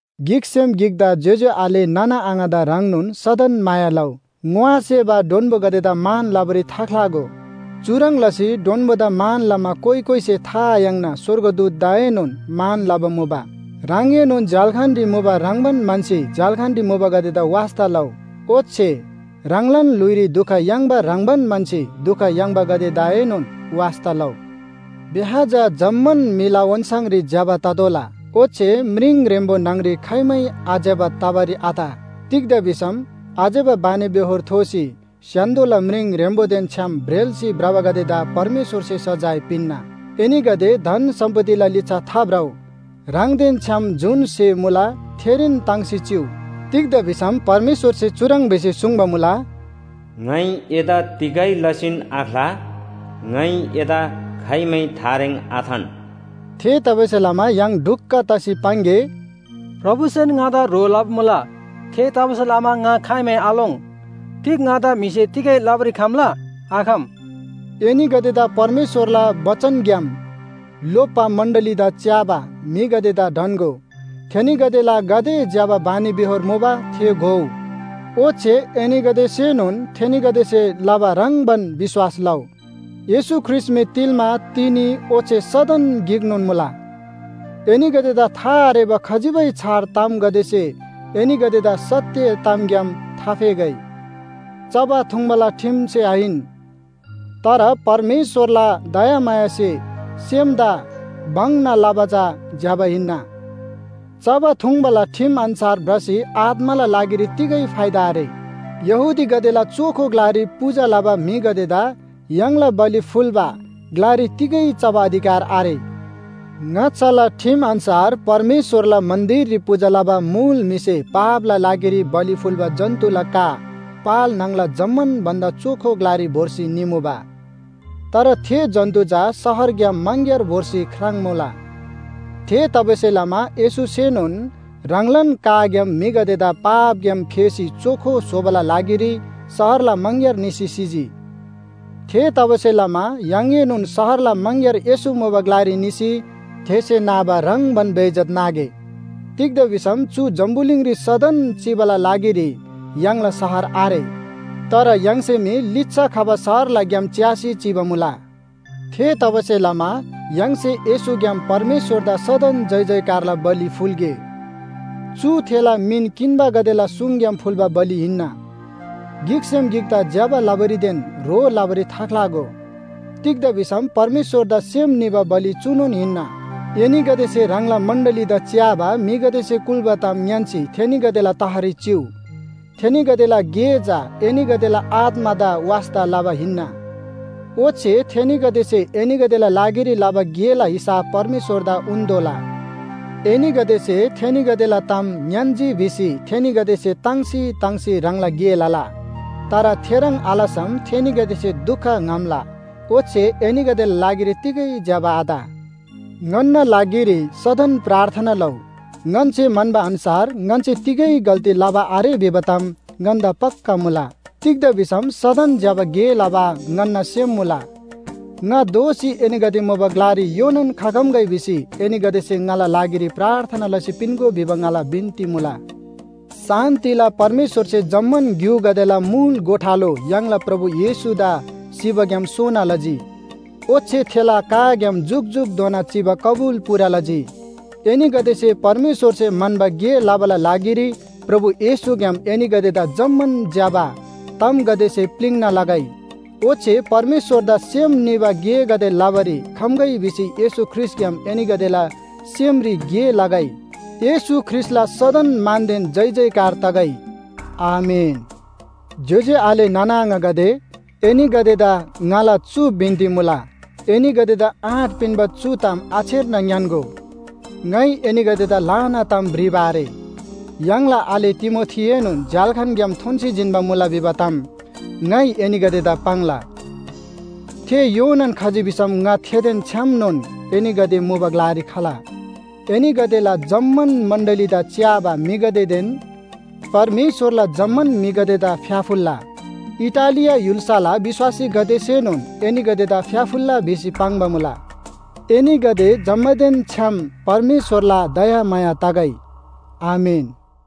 गिकसेम गिकदा ज्‍योज्‍यो आले नाना आङादा ह्रङ्नोन सदन माया लउ। ङोआसेबा डोन्‍बोगदेदा मान लबारी थाख्‍लागो। चुह्रङ् लसी डोन्‍बोदा मान लमा कोइ कोइसे था आयाङ्ना स्‍वर्गदूतदाएनोन मान लबा मुबा। ह्राङएनोन झ्‍याल्‍खानरी मुबा ह्रङ्‌बान म्‍हन्‍सी झ्‍याल्‍खानरी मुबागदेदा वास्‍ता लउ। ओच्‍छे ह्राङलान ल्‍हुइरी दुख याङ्बा ह्रङ्‌बान म्‍हन्‍सी दुख याङ्बागदेदाएनोन वास्‍ता लउ। ब्‍याह चा जम्‍मान म्‍हिला ओन्‍छाङरी ज्‍यबा ततोःला। ओच्‍छे म्रिङ ह्रेम्‍बो न्‍हङरी खाइमै आज्‍यबा तबारी आत। तिग्‍दा भिसम आज्‍यबा बानीबेहोर थोसी स्‍य्‍हान्‍दोला म्रिङ ह्रेम्‍बोदेन छ्‌याम ब्रेल्‍सी भ्रबागदेदा परमेश्‍वरसे सजाय पिन्‍ना। एनीगदे धन सम्‍पत्तिला लिच्‍छा थाभ्रउ, ह्राङदेन छ्‍याम जुन स्‍हे मुला थेरीन ताङ्सी चिउ। तिग्‍दा भिसम परमेश्‍वरसे चुह्रङ् भिसी सुङ्बा मुला, “ङाइ एदा तिगै लसीन आख्‍ला, ङाइ एदा खाइमै थारेङ आथान।” थेतबासेलमा य्‍हाङ ढुक्‍क तसी पाङ्‌गे, “प्रभुसेन ङादा ह्रो लबा मुला, थेतबासेलमा ङा खाइमै आलोङ्। तिग ङादा म्‍हिसे तिगै लबारी खम्‍ला? आखम।” एनीगदेदा परमेश्‍वरला बचनग्‍याम लोप्‍बा मण्‍डलीदा च्‍याबा म्‍हिगदेदा ढन्‍गो। थेनीगदेला गाते ज्‍यबा बानीबेहोर मुबा थे घोउ। ओच्‍छे एनीगदेसेनोन थेनीगदेसे लबा ह्रङ्‌बान विश्‍वास लउ। येशू ख्रीष्‍ट मी तिल्‍मा, तिनी ओच्‍छे सदन गिकनोन मुला। एनीगदेदा था आरेबा खजिबै छार तामगदेसे एनीगदेदा सत्‍य तामग्‍याम थाफेगै। चबा थुङ्‌बाला ठिमसे आहिन, तर परमेश्‍वरला दयामायासे सेमदा भङ्‍ना लबा चा ज्‍यबा हिन्‍ना। चबा थुङ्‌बाला ठिम अन्‍छार भ्रसी आत्‍माला लागिरी तिगै फाइदा आरे। यहूदीगदेला चोखो ग्‍लारी पूजा लबा म्‍हिगदेदा य्‍हाङला बलि फुल्‍बा ग्‍लारी तिगै चबा अधिकार आरे। ङाच्‍छाला ठिम अन्‍छार परमेश्‍वरला मन्‍दिररी पूजा लबा मुल म्‍हिसे पापला लागिरी बलि फुल्‍बा जन्‍तुला का पाल न्‍हङला जम्‍मान भन्‍दा चोखो ग्‍लारी भोर्सी निमुबा। तर थे जन्‍तु चा शहरग्‍याम मङग्‍यार भोर्सी ख्राङ्मुला। थेतबासेलमा येशूसेनोन ह्राङलान काग्‍याम म्‍हिगदेदा पापग्‍याम फेसी चोखो स्‍होबाला लागिरी शहरला मङग्‍यार निसी सिजी। थेतबासेलमा य्‍हाङएनोन शहरला मङग्‍यार येशू मुबा ग्‍लारी निसी थेसे नाबा ह्रङ्‌बान बेइज्‍जत नागे। तिग्‍दा भिसम चु जम्‍बुलिङरी सदन चिबाला लागिरी य्‍हाङला शहर आरे। तर य्‍हाङसे मी लिच्‍छा खबा शहरला ग्‍याम च्‍यासी चिबा मुला। थेतबासेलमा य्‍हाङसे येशूग्‍याम परमेश्‍वरदा सदन जयजयकारला बलि फुल्‍गे। चु थेला मिन किन्‍बागदेला सुङग्‍याम फुल्‍बा बलि हिन्‍ना। गिकसेम गिकदा ज्‍यबा लबारीदेन ह्रो लबारी थाख्‍लागो। तिग्‍दा भिसम परमेश्‍वरदा सेम निबा बलि चुनोन हिन्‍ना। एनीगदेसे ह्राङला मण्‍डलीदा च्‍याबा म्‍हिगदेसे कुल्‍बा ताम ङ्‌यान्‍सी थेनीगदेला तहरी चिउ। थेनीगदेला गे चा एनीगदेला आत्‍मादा वास्‍ता लबा हिन्‍ना। ओच्‍छे थेनीगदेसे एनीगदेला लागिरी लबा गेला हिसाब परमेश्‍वरदा उन्‍तोःला। एनीगदेसे थेनीगदेला ताम ङ्‌यान्‍जी भिसी थेनीगदेसे ताङ्सी ताङ्सी ह्राङला गे लला। तर थेह्रङ् आलसम थेनीगदेसे दुख ङ्‍हम्‍ला, ओच्‍छे एनीगदेला लागिरी तिगै ज्‍यबा आत। ङन्‍ना लागिरी सदन प्रार्थना लउ। ङन्‍से म्‍हन्‍बा अन्‍छार ङन्‍से तिगै गल्‍ती लबा आरे भिबा ताम ङन्‍दा पक्‍का मुला। तिग्‍दा भिसम सदन ज्‍यबा गे लबा ङन्‍ना सेम मुला। ङा दोःसी एनीगदे मुबा ग्‍लारी योनान खखम्‍गै भिसी एनीगदेसे ङाला लागिरी प्रार्थना लसी पिन्‍गो भिबा ङाला बिन्‍ती मुला। शान्‍तिला परमेश्‍वरसे जम्‍मान ग्‍युगदेला मुल गोठालो य्‍हाङला प्रभु येशूदा सिबाग्‍याम सोना लजी। ओच्‍छे थेला काग्‍याम जुकजुकधोना चिबा कबुल पूरा लजी। एनीगदेसे परमेश्‍वरसे म्‍हन्‍बा गे लबाला लागिरी प्रभु येशूग्‍याम एनीगदेदा जम्‍मान ज्‍यबा तामगदेसे प्‍लिङ्ना लगै। ओच्‍छे परमेश्‍वरदा सेम निबा गेगदे लबारी खम्‍गै भिसी येशू ख्रीष्‍टग्‍याम एनीगदेला सेमरी गे लगै। येशू ख्रीष्‍टला सदन मानदेन जयजयकार तगै। आमेन। ज्‍योज्‍यो आले नाना आङागदे, एनीगदेदा ङाला चु बिन्‍ती मुला, एनीगदेदा आँट पिन्‍बा चु ताम आछेर्ना ङ्‌यान्‍गो। ङाइ एनीगदेदा ल्‍हाना ताम भ्रिबा आरे। य्‍हाङला आले तिमोथीएनोन झ्‍याल्‍खानग्‍याम थोन्‍सी जिन्‍बा मुला भिबा ताम ङाइ एनीगदेदा पाङ्ला। थे योनान खजी भिसम ङा थेदेन छ्‌यामनोन एनीगदे मुबा ग्‍लारी खला। एनीगदेला जम्‍मान मण्‍डलीदा च्‍याबा म्‍हिगदेदेन परमेश्‍वरला जम्‍मान म्‍हिगदेदा फ्‍याफुल्‍ला। इटालिया य्‍हुल्‍साला विश्‍वासीगदेसेनोन एनीगदेदा फ्‍याफुल्‍ला भिसी पाङ्बा मुला। एनीगदे जम्‍मानदेन छ्‌याम परमेश्‍वरला दयामाया तगै। आमेन।